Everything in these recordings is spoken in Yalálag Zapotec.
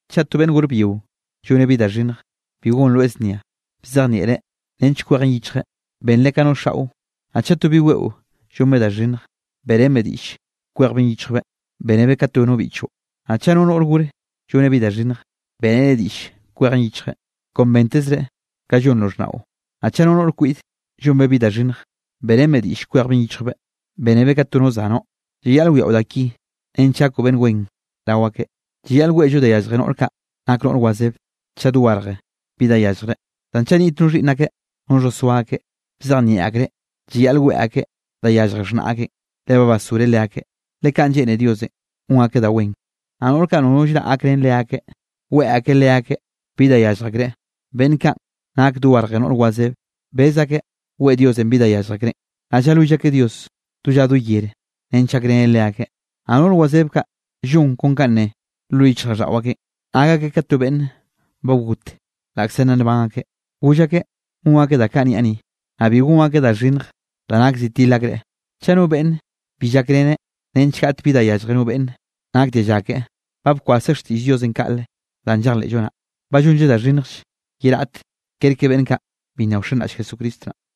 Chaꞌ to beꞌnn gor byio lloneꞌ bi da xhinnj, bi gonroeꞌ znia, bzejnieꞌreꞌ nench kwejeꞌn yichjeꞌ, benreꞌ ka no xaꞌo. Naꞌ chaꞌ to bi weꞌo llonbeꞌ da xhinnj, beꞌrenbeꞌ diꞌll kwejbeꞌn yichjbeꞌ, bénebeꞌ ka to no biꞌchoꞌ. Naꞌ chaꞌ no noꞌr gore lloneꞌ bi da xhinnj, beꞌreneꞌ diꞌll kwejeꞌn yichjeꞌn, kon bentezreꞌ ka llonroꞌ xhnaꞌon. Naꞌ chaꞌ no noꞌr kwiꞌde llonbeꞌ bi da xhinnj, beꞌrenbeꞌ diꞌll kwejbeꞌn yichjbeꞌ, bénebeꞌ ka to no zanoꞌ. Llayaꞌl wiaꞌo da ki nench gakoꞌ beꞌnn wen rao akeꞌ. Llayaꞌl weꞌllo da yallje noꞌr kaꞌ nak noꞌr wazebe, chaꞌ dogarje bi da yalljreꞌ. Zan chaꞌ niꞌt no xhiꞌnn akeꞌ no xhosoa akeꞌ, bzejnieꞌ akreꞌ llayaꞌl weꞌe akeꞌ da yallje xhnaꞌ akeꞌn, le ba basgoreꞌ leakeꞌn, le kaꞌn lleꞌne Diosenꞌ gon akeꞌ da wen. Naꞌ noꞌr kaꞌ nono llraꞌ gakrén leakeꞌ weꞌe akeꞌ leakeꞌ bi da yallj akreꞌ, beꞌnn kaꞌn nake dogarje noꞌr wazebe, bez akeꞌ weꞌe Dios bi danꞌ yallj akreꞌn, naꞌ llalwill akeꞌ Dios do lla do yere nench gakreneꞌ leakeꞌ. Naꞌ noꞌr wazeb kaꞌ llon kon kanꞌ ne lo yichjraꞌlldaꞌo akeꞌn, nak akeꞌ ka to beꞌnne ba got laꞌkze nna nban akeꞌ. Goll akeꞌ gon akeꞌ ka danꞌ niaꞌ ni, naꞌ bi gon akeꞌ da xhinnj da nak zi til akreꞌ. Chaꞌ no beꞌnne bi llakreneꞌ nench gaꞌt bi da yallje no beꞌnn nak dialla keꞌe, ba bkwaseꞌ xtiꞌll Diosenꞌ kaꞌle danꞌ llejleꞌllo naꞌ, ba llonlleꞌ da xhinnjll ye raꞌt kerke beꞌnn kaꞌ bi nna wxenraꞌll Jesucristo naꞌ.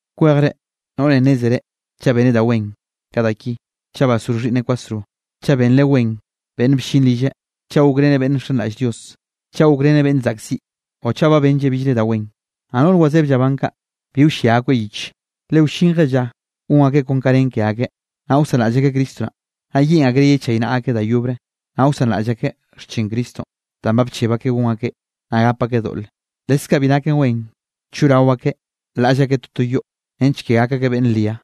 Kwejre noꞌre nnézere chaꞌ beneꞌ da wen, ka da ki: chaꞌ basgor xhiꞌnneꞌ kwasro, chaꞌ benreꞌ wen beꞌnn bllin rilleꞌ, chaꞌ gokreneꞌ beꞌnn nxenraꞌll Dios, chaꞌ gokreneꞌ beꞌnn zaꞌkziꞌ o chaꞌ ba benlleꞌ billre da wen. Naꞌ noꞌr wazeb llaban kaꞌ, bi wllia akoeꞌ yich, le wllinje lla gon akeꞌ kon kanꞌ nen ke akeꞌ, naꞌ wsanraꞌll akeꞌ Cristo naꞌ, naꞌ yeꞌn akreꞌ yechaynaꞌa akeꞌ da yobre. Naꞌ wsanraꞌll akeꞌ xchin Cristonꞌ danꞌ ba bcheb akeꞌ gon akeꞌn, naꞌ gap akeꞌ doꞌle. Leskaꞌ bi naken wen choꞌrao akeꞌ laꞌll akeꞌ toto yoꞌ, nench ke gak akeꞌ beꞌnn ria,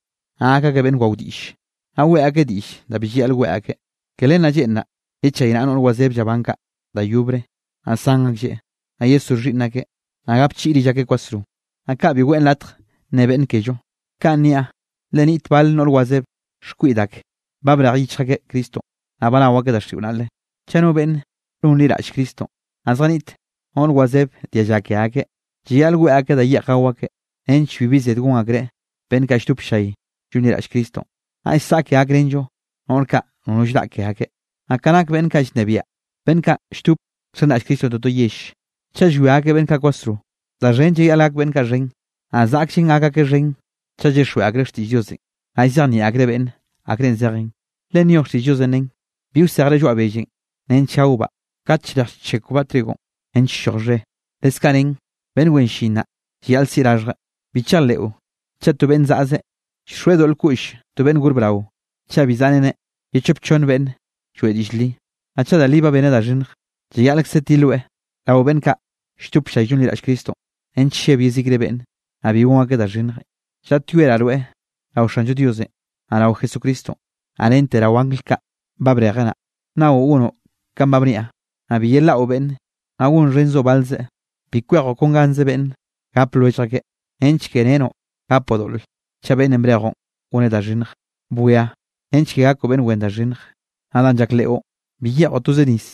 naꞌ gak akeꞌ beꞌnn wao diꞌlle, naꞌ weꞌe akeꞌ diꞌll da bi llayaꞌl weꞌe akeꞌ. Ke len naꞌ lleꞌnraꞌ yechaynaꞌa noꞌr wazeb llaban kaꞌ da yobre, naꞌ san aklleꞌ, naꞌ yesgor xhiꞌnn akeꞌ, naꞌ gapchiꞌi rill akeꞌ kwasro, naꞌ kaꞌ bi weꞌn latj nne beꞌnne kello. Kaꞌn niaꞌ, le niꞌt bal noꞌr wazeb xkwiꞌd ake ba brej yichj akeꞌ Cristonꞌ, naꞌ ba nao akeꞌ daxiꞌon naꞌle. Chaꞌ no beꞌnn nonliraꞌll Cristonꞌ, naꞌ zjaniꞌt noꞌr wazebe dialla ke akeꞌ, llayaꞌl weꞌe akeꞌ da yeꞌj gao akeꞌ, nench bibi zed gon akreꞌ beꞌnn kaꞌ lldop ll-llay llonliraꞌll Cristonꞌ. Naꞌll saꞌke gakrenllo noꞌr kaꞌ nono llraꞌ ke akeꞌ. Naꞌ ka nak beꞌnn kaꞌ llnebiaꞌ beꞌnn kaꞌ lldop nxenraꞌll Cristonꞌ toto yell, chaꞌ llwia akeꞌ beꞌnn kaꞌ kwasro, da xhen llayaꞌl gak beꞌnn kaꞌ xhen. Naꞌ zaꞌkllenꞌ gak akeꞌ xhen chaꞌ llyixjweꞌ akreꞌ xtiꞌll Diosenꞌ, naꞌ llzejnieꞌ akreꞌ beꞌnne akrenꞌ zejen. Le nyoj xtiꞌll Diosenꞌ nen: “Bi wsejre lloaꞌ bellenꞌ nench gaobaꞌ kate llrej llchekwbaꞌ trigonꞌ nench lloj xhe.” Leskaꞌ nen: “Beꞌnn wen llin naꞌ, llayaꞌl siꞌi raxhjeꞌ.” Bi chejleꞌo chaꞌ to beꞌnne zaꞌze llxoeꞌ doꞌl koꞌll to beꞌnn gor brao, chaꞌ bi zaꞌreneꞌ ye chop chonn beꞌnn lloeꞌ diꞌll li. Naꞌ chaꞌ da li ba beneꞌ da xhinnj, llayaꞌlkze tiloeꞌ rao beꞌnn kaꞌ lldop ll-llay llonliraꞌll Cristonꞌ, nench lleb yezikre beꞌnn, naꞌ bi gon akeꞌ da xhinnje. Llaꞌtyoeraꞌ rweꞌ rao Xanllo Diosenꞌ naꞌ rao Jesucristonꞌ, naꞌ rente rao angl kaꞌ ba brejeꞌ naꞌ, nnaoꞌ gonoꞌ kanꞌ ba bniaꞌ, naꞌ bi yelaꞌo beꞌnne, naꞌ gonxhenzoꞌ balzeꞌ. Bi kwejoꞌ kon ganze beꞌnnenꞌ gape lwellj akeꞌn, nench kere renoꞌ gapoꞌ doꞌle chaꞌ beꞌnnenꞌ brejoꞌn goneꞌ da xhinnj. Bwia nench ke gakoꞌ beꞌnn wen da xhinnj. Naꞌ danꞌ llak leꞌo, bi yeꞌjoꞌ toze nis,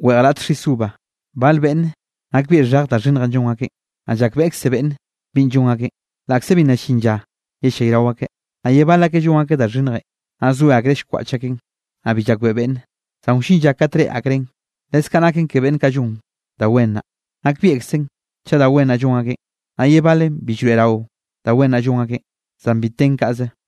weꞌj raꞌt xis uva. Bal beꞌnne nakbieꞌ xhej da xhinnjenꞌ llon akeꞌn, naꞌ llakbeꞌkze beꞌnne binꞌ llon akeꞌ, laꞌkze bi nna llin lla yellayrao akeꞌ. Naꞌ ye bal akeꞌ llon akeꞌ da xhinnjenꞌ, naꞌ zoe akreꞌ llkwaꞌch akeꞌn, naꞌ bi llakbeꞌe beꞌnne, zan wllin lla kate reꞌe akreꞌn. Leskaꞌ naken ke beꞌnn kaꞌ llon da wen naꞌ, nakbieꞌkzen chaꞌ da wen naꞌ llon akeꞌ, naꞌ ye balen bi llroeꞌrawe da wen naꞌ llon akeꞌ, zan bi ten kaꞌze.